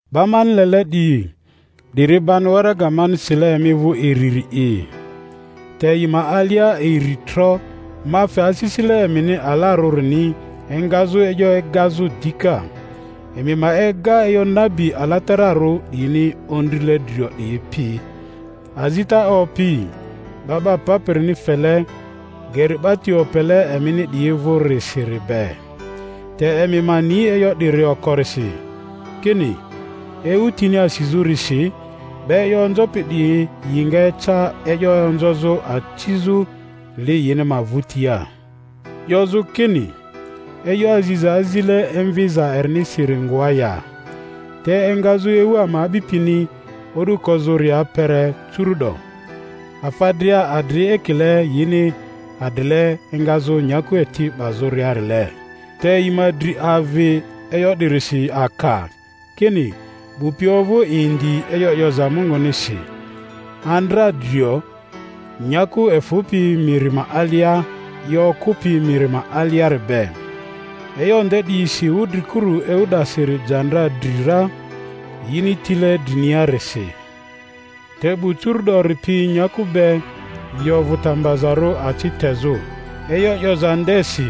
Ba mani lele 'diyi, 'diri bani waraga mani sile emi vᴜ iriri'i, te yi ma alia iri tro ma fe asisile emini alarᴜrini engazᴜ e'yo egazᴜ dika; emi ma ega e'yo nabi alatararᴜ 'diyini ondrile drio 'diyi pi, azita Opi 'Ba 'ba Papirini fele geri 'ba ti opele emini 'diyi vᴜrisiri be. Te emi ma ni e'yo 'diri okorisi, kini, ewu tini asizᴜrisi 'ba e'yo onzopi 'diyi yi nga eca e'yo onzozᴜ, acizᴜ li yini ma vᴜtia, 'yozᴜ kini, E'yo aziza azile emviza erinisiri ngoa ya? Te engazᴜ ewu ama a'bipini o'du kozᴜria kpere curu’do, afa dria adri ekile yini adrile engazᴜ nyaku eti 'bazᴜriarile. Te yi ma dri avi e'yo 'dirisi aka, kini, 'bu pi ovᴜ indi e'yo 'yoza Mungunisi andra drio, nyaku efᴜpi miri ma alia i okᴜpi miri ma aliari be; e'yo nde 'diyisi wudrikuru ewu 'dasiri ja ndra dri ra, yini tile driniarisi. Te 'bu curu'dori pi nyaku be, yi ovᴜ ta mbazarᴜ aci tezᴜ e'yo 'yoza ndesi,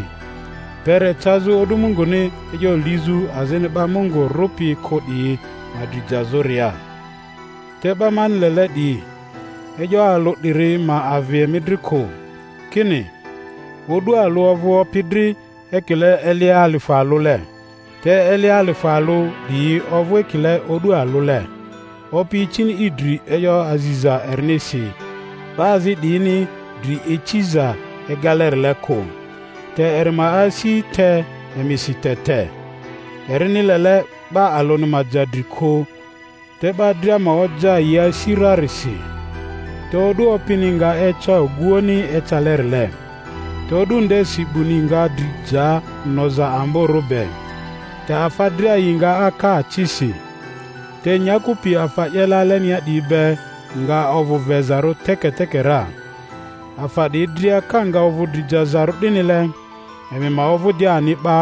kpere cazᴜ o'du Munguni e'yo lizᴜ azini 'ba Mungu rᴜpi kᴜ 'diyi ma dri jazᴜria. Te 'ba mani lele 'diyi, e'yo alᴜ 'diri ma avi emi dri kᴜ, kini, o'du alᴜ ovᴜ Opi dri ekile eli alifᴜ alᴜle, te eli alifᴜ alᴜ 'diyi ovᴜ ekile o'du alᴜle. Opi icini i dri e'yo aziza erinisi, 'ba azi 'diyini dri iciza egalerile kᴜ, te eri ma asi te emisi te te, erini lele 'ba alᴜni ma ja dri kᴜ, te 'ba dria ma oja yi asi rarisi. Te o'du Opini nga eca oguoᴜni ecalerile, te o'du ndesi 'buni nga dri ja noza amborᴜ be, te afa dria yi nga aka acisi, te nyaku pi afa 'yele alenia 'diyi be nga ovᴜ vezarᴜ teketeke ra. Afa 'diyi dria ka nga ovᴜ dri jazarᴜ 'dinile, emi ma ovᴜ di ani 'ba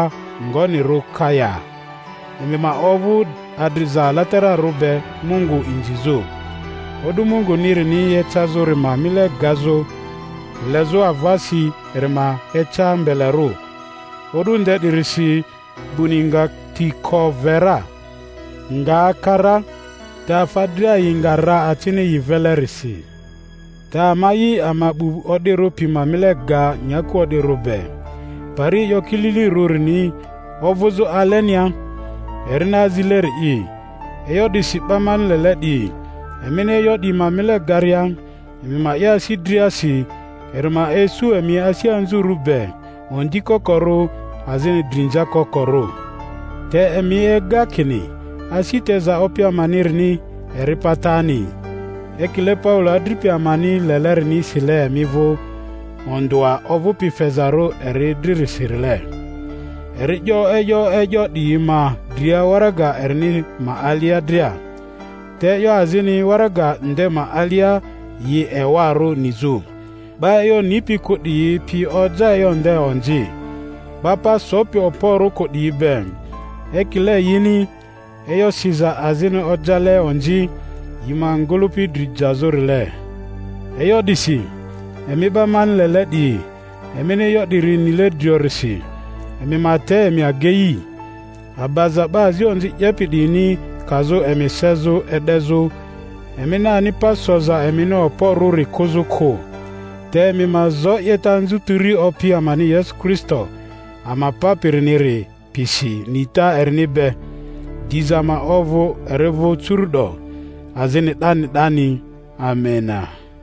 ngonirᴜ ka ya? Emi ma ovᴜ adriza alatararᴜ be Mungu inzizᴜ, o'du Mungunirini ecazᴜri ma mile gazᴜ, lezᴜ avasi eri ma eca mbelerᴜ. O'du nde 'dirisi 'buni nga ti ko ve ra, nga aka ra, te afa dria yi nga ra acini yi velerisi! Te ama'i, ama 'bu o'dirᴜ pi ma mile ga nyaku o'dirᴜ be, pari e'yo kililirᴜrini ovᴜzᴜ alenia, erini azileri'i. E'yo 'disi, 'ba mani lele 'diyi, emini e'yo 'diyi ma mile garia, emi ma 'ye asi driasi eri ma isu emi asi anzurᴜ be, ondi kokorᴜ, azini drinza kokorᴜ. Te emi ega kini asi teza Opi amanirini eri patani; ekile Paulo adripi amani lelerini sile emi vᴜ, ondᴜa ovᴜpi fezarᴜ eri dririsirile. Eri 'yo e'yo e'yo 'diyi ma dria waraga erini ma alia dria. Te e'yo azini waraga nde ma alia yi ewarᴜ nizᴜ; 'ba e'yo nipi kᴜ 'diyi pi oja e'yo nde onzi, 'ba pa sopi okporᴜ kᴜ 'diyi be, ekile yini e'yo siza azini ojale onzi yi ma ngᴜlᴜpi dri jazᴜrile. E'yo 'disi, emi 'ba mani lele 'diyi, emini e'yo 'diri nile driorisi, emi ma te emi agei, abaza 'ba azi onzi 'yepi 'diyini kazᴜ emi sezᴜ e'dezᴜ, emini ani pa soza emini okporᴜri kᴜzᴜ kᴜ. Te emi ma zo 'yeta anzutiri Opi amani Yesu Kristo ama Papiriniri pisi nita erini be. Diza ma ovᴜ eri vᴜ curu'do azini 'dani 'dani. Amena.